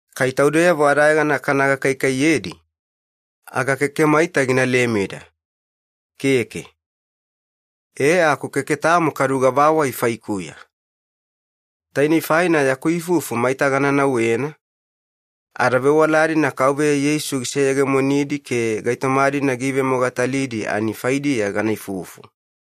Kai taudeyavo adayegana kana gakaikaiyedi, aga keke maita gina lemeda, keke. E aku keke tamo kadu gavawai faikuya. Tainei faina yaku ifufu maita gana nauwena, ada vewala-dina Kauveya Yeisu giseyegemonidi ke gaitoma-dina giivemogatalidi ani faidiya gana ifufu.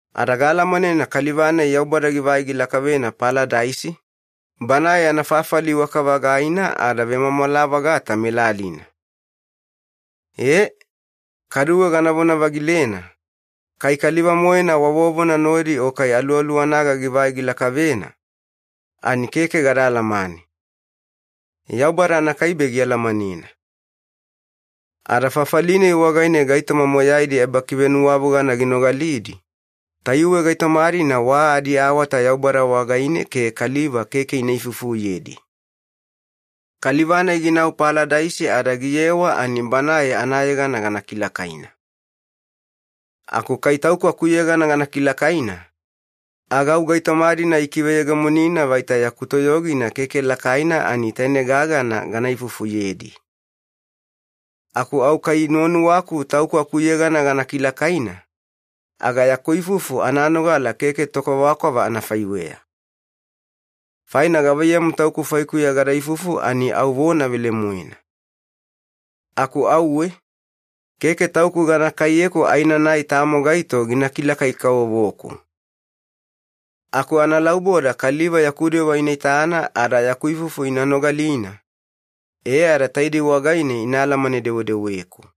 Ada gaalamanena kaliva-nai Yaubada givai gilakavena Paladaisi, Banae yana fafali iwaka-vagaina ada vemwamwala-vagata melalina. E, kaduwe ganavona-vagilena, kai kaliva-moena wa vovona nodi o kai aluwaluwanaga givai gilakavena, ani keke gada alamane. Yaubada anakaibe gialamanena. Ada fafali-nai wagaine gaitoma moyaidi ebakivenuwavogana ginogalidi, tayuwe gaitoma-dina wa adiawata Yaubada wagaine ke kaliva keke ina ifufuyedi. Kaliva-nai ginau Paladaisi ada giyewa ani banae anayegana gana kilakaina. Aku kai tauku akuyegana gana kilakaina, aga au gaitoma-dina ikiveyegemonina vaita yaku toyogina keke lakaina ani taine gagana gana ifufuyedi. Aku au kai nuwanuwaku tauku akuyegana gana kilakaina, aga yaku ifufu ananogala keke tokwavakwava anafaiweya. Faina gavaiyamu tauku faikuya gada ifufu ani au vona velemoena. Aku auwe, keke tauku gana kaiyeku aenanai tamo gaito gina kilakai-kavovoku. Aku analauboda kaliva yaku dewa ina itana ada yaku ifufu ina nogalina, e ada taidei wagaine ina alamane-dewedeweku.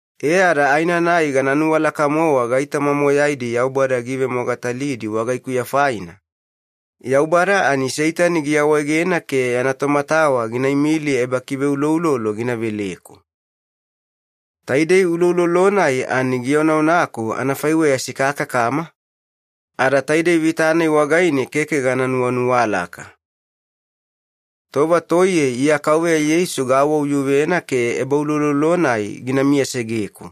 E ada aenanai gana nuwalaka-mowa gaitoma moyaidi Yaubada giivemogatalidi wagaikuya faina, Yaubada ani Seitani giawaegena ke yana tomatawa gina imili ebakiveuloulolo gina veleku. Taidei uloulolo-nai ani gionaonaku anafaiweya sikakakama, ada taidei vita-nai wagaine keke gana nuwanuwalaka. Tova toiye Iya Kauveya Yeisu gaawauyuvena ke ebauloulolo-nai gina miyasegeku.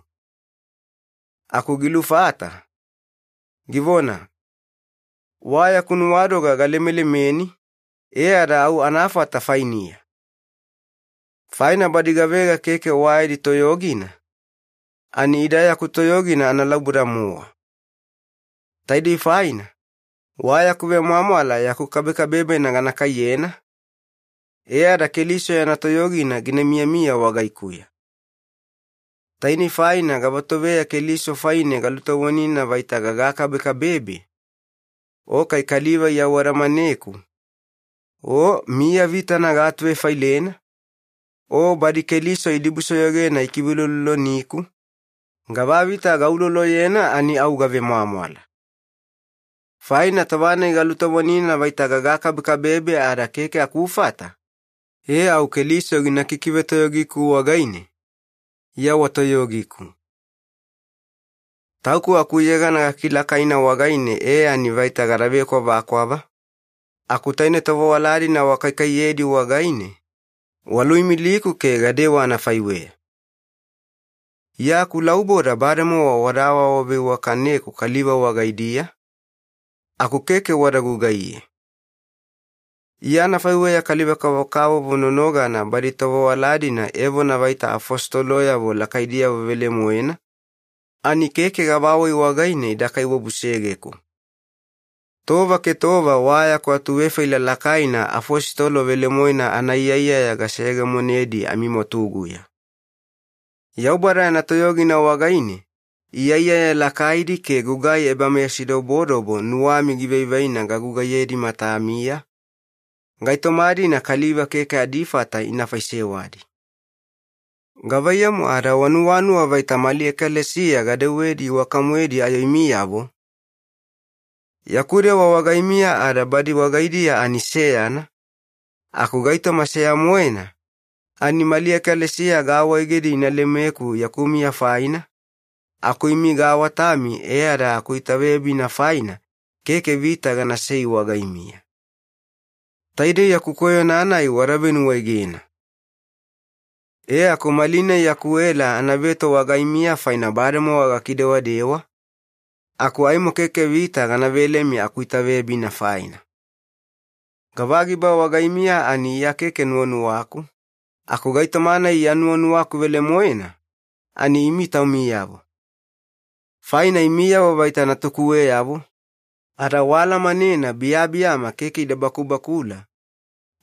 Aku gilufata, givona, “Wa yaku nuwadoga galemelemeni, e ada au anafata fainiya. Faina badi gavega keke wa yadi toyogina, ani ida yaku toyogina analauboda-mowa.” Taidei faina, wa yaku vemwamwala yaku kabekabebena gana kaiyena, e ada Keliso yana toyogina gina miyamiya wagaikuya. Tainei faina gavatoveya Keliso faine galutovonina vaita gagakabekabebe, o kai kaliva iawadamaneku, o miya vitana gaatuvefailena, o badi Keliso idibusoyogena ikiveulouloloniku, gavavita gauloloyena ani au gavemwamwala. Faina tova-nai galutovonina vaita gagakabekabebe ada keke akufata, e au Keliso gina kikivetoyogiku wagaine, Iya wa toyogiku. Tauku akuyegana gakilakaina wagaine e ani vaita gada vekwavakwava, aku taine tovewala-dina wakaikaiyedi wagaine, waluimiliku ke gadewa anafaiweya. Iya akulauboda bademowa wada awaawaveiwakaneku kaliva wagaidiya, aku keke wada gugaiye. Iya anafaiweya kaliva-kavokavovo nonogana badi tovewala-dina evona vaita afositoloyavo lakaidiyavo velemoena, ani keke gavawai wagaine ida kaiwabusegeku. Tova ke tova wa yaku atuvefaila lakaina afositolo velemoena anaiyaiyaya gaseyegemonedi amimwatuguya. Yaubada yana toyogina wagaine iyaiyaya lakaidi ke gugai ebameyasidobodobo nuwami givaivaina gagugaiyedi matamiya, gaitoma-dina kaliva keke adifata ina faisewadi. Gavaiyamu ada wanuwanuwa vaita mali ekalesiya gadewedi iwaka-moedi ayo imiyavo? Yaku dewa wagaimiya ada badi wagaidiya ani seyana, aku gaitoma seya-moena, ani mali ekalesiya gaawaegedi ina lemeku yaku miya faina, aku imi gaawatami e ada akuitaveyabina faina keke vita ganasei wagaimiya. Taidei yaku koyona-nai wada venuwaegena! E aku malinai yaku ela anaveto wagaimiya faina bademowa gakidewadewa, aku aimo keke vita gana velemi akuitaveyabina faina. Gavagiba wagaimiya ani Iya keke nuwanuwaku, aku gaitoma-nai Iya nuwanuwaku velemoena, ani imi taumiyavo. Faina imiyavo vaita natukuweyavo, ada waalamanena biyabiyama keke ida bakubakula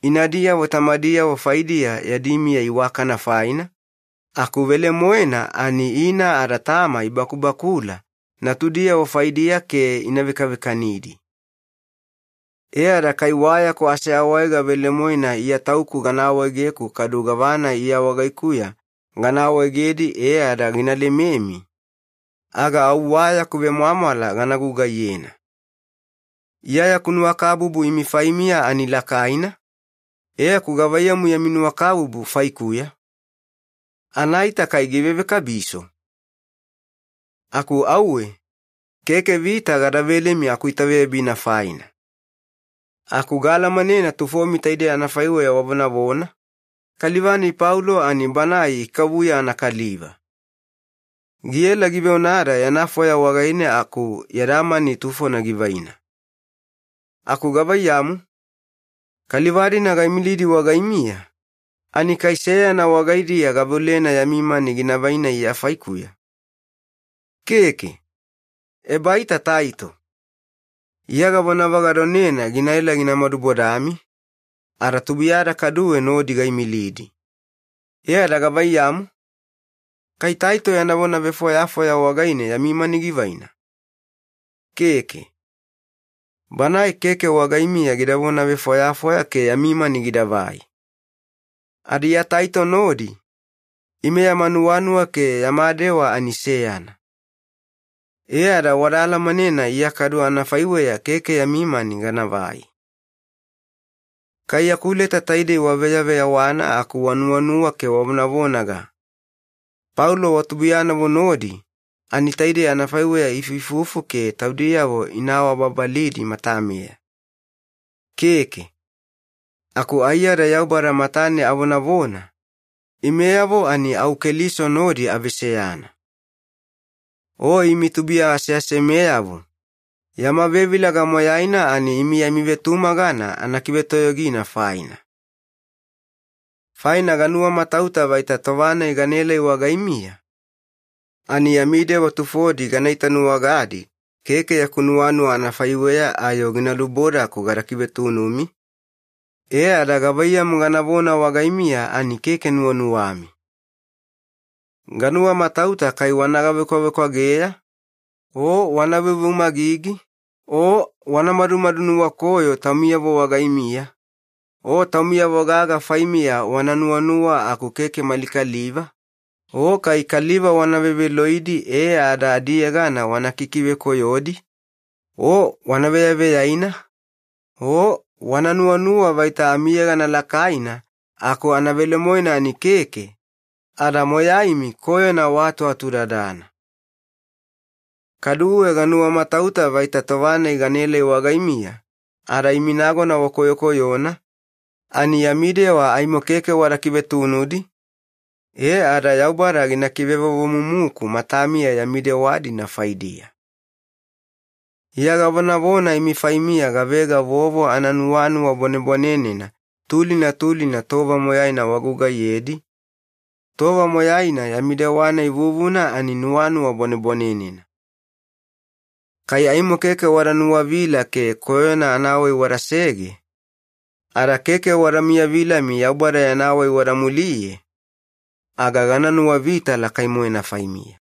inadiyavo tamadiyavo faidiya yadi miya iwakana faina, aku velemoena ani ina ada tama ibakubakula natudiyavo faidiya ke ina vekavekanidi. E ada kai wa yaku aseawaega velemoena Iya tauku gana awaegeku kadu gavana Iya wagaikuya gana awaegedi e ada gina lememi, aga au wa yaku vemwamwala gana gugaiyena. Iya yaku nuwakabubu imi faimiya ani lakaina, e aku gavaiyamu yami nuwakabubu faikuya? Anaita kai givevekabiso? Aku auwe, keke vita gada velemi akuitaveyabina faina. Aku gaalamanena tufomi taidei anafaiweya wavonavona, “Kaliva-nai Paulo ani banae ikavuya anakaliva. Giela giveonada yana fwaya wagaine aku yada mani tufona givaina.” Aku gavaiyamu? Kaliva-dina gaimilidi wagaimiya, ani kai seyana wagaidiya gaveolena yami mani gina vaina Iya faikuya? Keke! Ebaita Taito. Iya gavonavagadonena ginaela gina madubodami, ada tubuiyada kaduwe nodi gaimilidi. E ada gavaiyamu? Kai Taito yana vonavefwayafwaya wagaine yami mani givaina? Keke. Banae keke wagaimiya gida vonavefwayafwaya ke yami mani gidavai. Ada Iya Taito nodi, ime yama nuwanuwa ke yama dewa ani seyana. E ada wada alamanena Iya kadu anafaiweya keke yami mani ganavai. Kai yaku leta taidei waveyaveyawana aku wanuwanuwa ke wavonavonaga, “Paulo wa tubuiyanavo nodi ani taidei anafaiweya iifuifufu ke taudiyavo ina awabababalidi matameya.” Keke. Aku aiyada Yaubada matane avonavona, imeyavo ani au Keliso nodi aveseyana. O imi tubuiya aseasemeyavo, yama vevilaga moyaina ani imi yami vetumagana anakivetoyogina faina. Faina ganuwamatauta vaita tova-nai ganaelai wagaimiya, ani yami dewa tufodi gana itanuwagadi keke yaku nuwanuwa anafaiweya ayo gina lubodaku gada kivetunumi, e ada gavaiyamu ganavona wagaimiya ani keke nuwanuwami. Ganuwamatauta kai wana gavekwavekwageya, o wana veuveumagigi, o wana madumadu nuwakoyo taumiyavo wagaimiya, o taumiyavo gaga faimiya wana nuwanuwa aku keke mali kaliva, o kai kaliva wana veveloidi e ada adiyegana wana kikivekoyodi, o wana veyaveyaina, o wana nuwanuwa vaita amiyegana lakaina aku anavelemoena ani keke, ada moyaimi koyona waatuatudadana. Kaduwe ganuwamatauta vaita tova-nai ganaelai wagaimiya ada imi nagona wakoyokoyona, ani yami dewa aimo keke wada kivetunudi, e ada Yaubada gina kivevovomumuku matamiya yami dewa-dina faidiya. Iya gavonavona imi faimiya gavega vovo ananuwanuwa bwanebwanenena tulina tulina tova moyaina wagugaiyedi, tova moyaina yami dewa-nai vuvuna ani nuwanuwa bwanebwanenena. Kai aimo keke wada nuwavila ke koyona anawai wadasege, ada keke wada miyavilami Yaubada yana wai wada muliye, aga gana nuwavita lakai-moena faimiya.